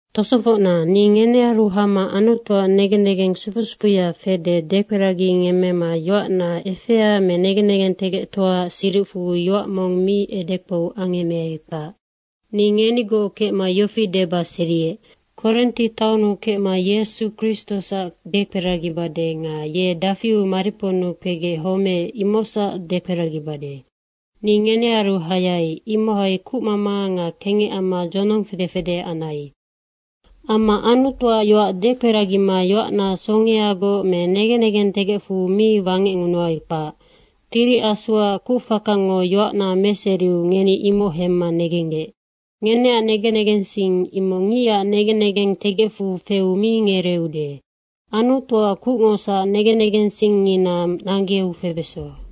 Tosofocna, ni ngenearu hama Anutuac negen negeng sufu sufuya fede dekperagingemmema yoacna efea me negen negentegectoaac siricfu yoac mong mi edekpou angemmeai, kpac. Ni ngenigoc kecma yofi deba seriec, “Korinti taonnu kecma Yesu Kristosac dekperagibade nga ye dafiu mariponnu kpegec homeec, imocsac dekperagibade.” Ni ngenearu hayai, imohai kucmama nga kengec amma dzonong fede fede anai. Amma Anutuac yoac dekperagima yoacna songeagoc me negen negentegecfu mi wangecngunuai, kpac. Tiri Asuac kucfakango yoacna meseriu ngeni imoc hemma negenggec. Ngeneac negen negensing imoc ngicac negen negentegecfu feu mi ngereeude. Anutuac kucngosac negen negensingngina nanggeu febeso.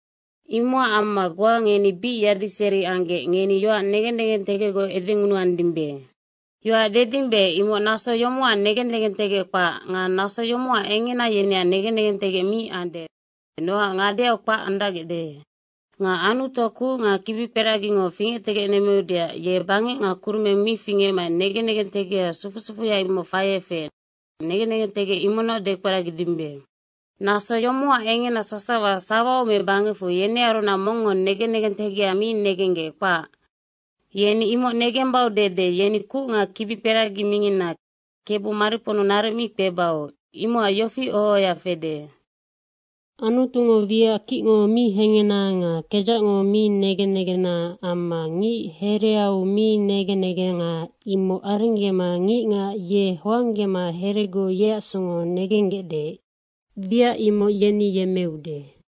Imocac amma goa ngeni bic yadiseri anggec, ngeni yoac negen negentegecgoc edengunuandimbe. Yoac dedimbe imoc naso yomocac negen negentegec kpac nga naso yomocac engena yeneac negen negentegec mi ande, nocac ngadeau kpac andacgecde. Nga Anutuac kuc nga kibikperagingo fingectegecnemmeudeac ye bangec nga kurumeng mi fingecmaec negen negentegeha sufu sufuya imoc faiec feec, negen negentegec imocnoc dekperagidimbe. Naso yomocac engena sasawa sawau me bangecfu yenearunac mongngo negen negentegeha mi negenggec, kpac. Yeni imoc negembau dede yeni kuc nga kibikperagi mingina Kebu mariponnu naric mi kpebau. Imocac yofi oho ohoya fede, “Anutungo wiac kicngo mi hehena nga kedzacngo mi negen negena amma ngic hereau mi negen negenga, imoc arenggema ngicngac ye hoanggema heregoc yeac songo negenggecde, wiac imoc yeni yemmeude.”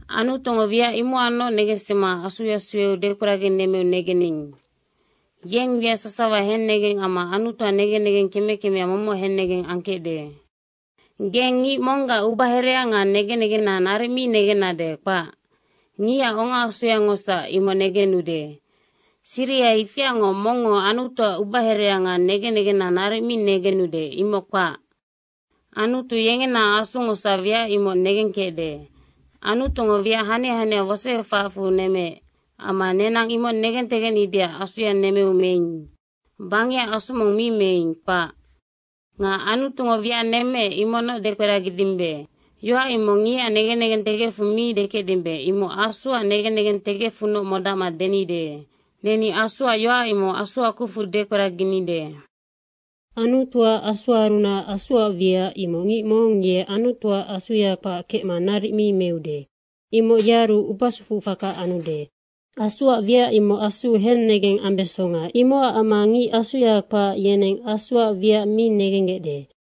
Anutungo wiac imocacnoc negensima Asuya sueu dekperaginemmeu negening. Yeng wiac sasawa hennegeng amma Anutuac negen negeng keme kemea momoc hennegeng angkecde. Geng ngic monggac ubaherea nga negen negena naric mi negennade, kpac. Ngicac ongaasungosac imoc negenude. Siriha ifiangoc mongngo Anutuac ubaherea nga negen negena naric mi negenude, imoc kpac. Anutu yengena Asungosac wiac imoc negengkecde. Anutungo wiac hania hania wosoefacfu nemmeec. Amma nenang imoc negentegecnideac Asuya nemmeu meing. Bangecac asu mong mi meing, kpac. Nga Anutungo wiac nemmeec, imocnoc dekperagidimbe. Yoac imoc ngicac negen negentegecfu mi dekecdimbe, imoc Asuac negen negentegecfunoc modacma denide. Neni Asuac yoac imoc Asuac kucfu dekperaginide. Anutuac Asuarunac Asuac wiac, imoc ngic mong ye Anutuac Asuya kpac kecma naric mi meude. Imoc yearu ubasufu faka anude. Asuac wiac imoc asuu henegeng ambesonga, imocac amma ngic Asuya kpac, yeneng Asuac wiac mi negenggecde.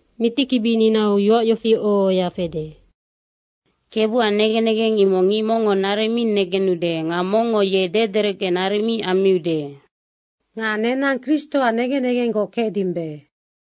Mitikibininau yoac yofi oho ohoya fede, “KEBUAC negen negeng imoc ngic mongngo naric mi negenude nga mongngo ye dederecge naric mi ammiude.” Nga nenang Kristoac negen negenggoc kecdimbe.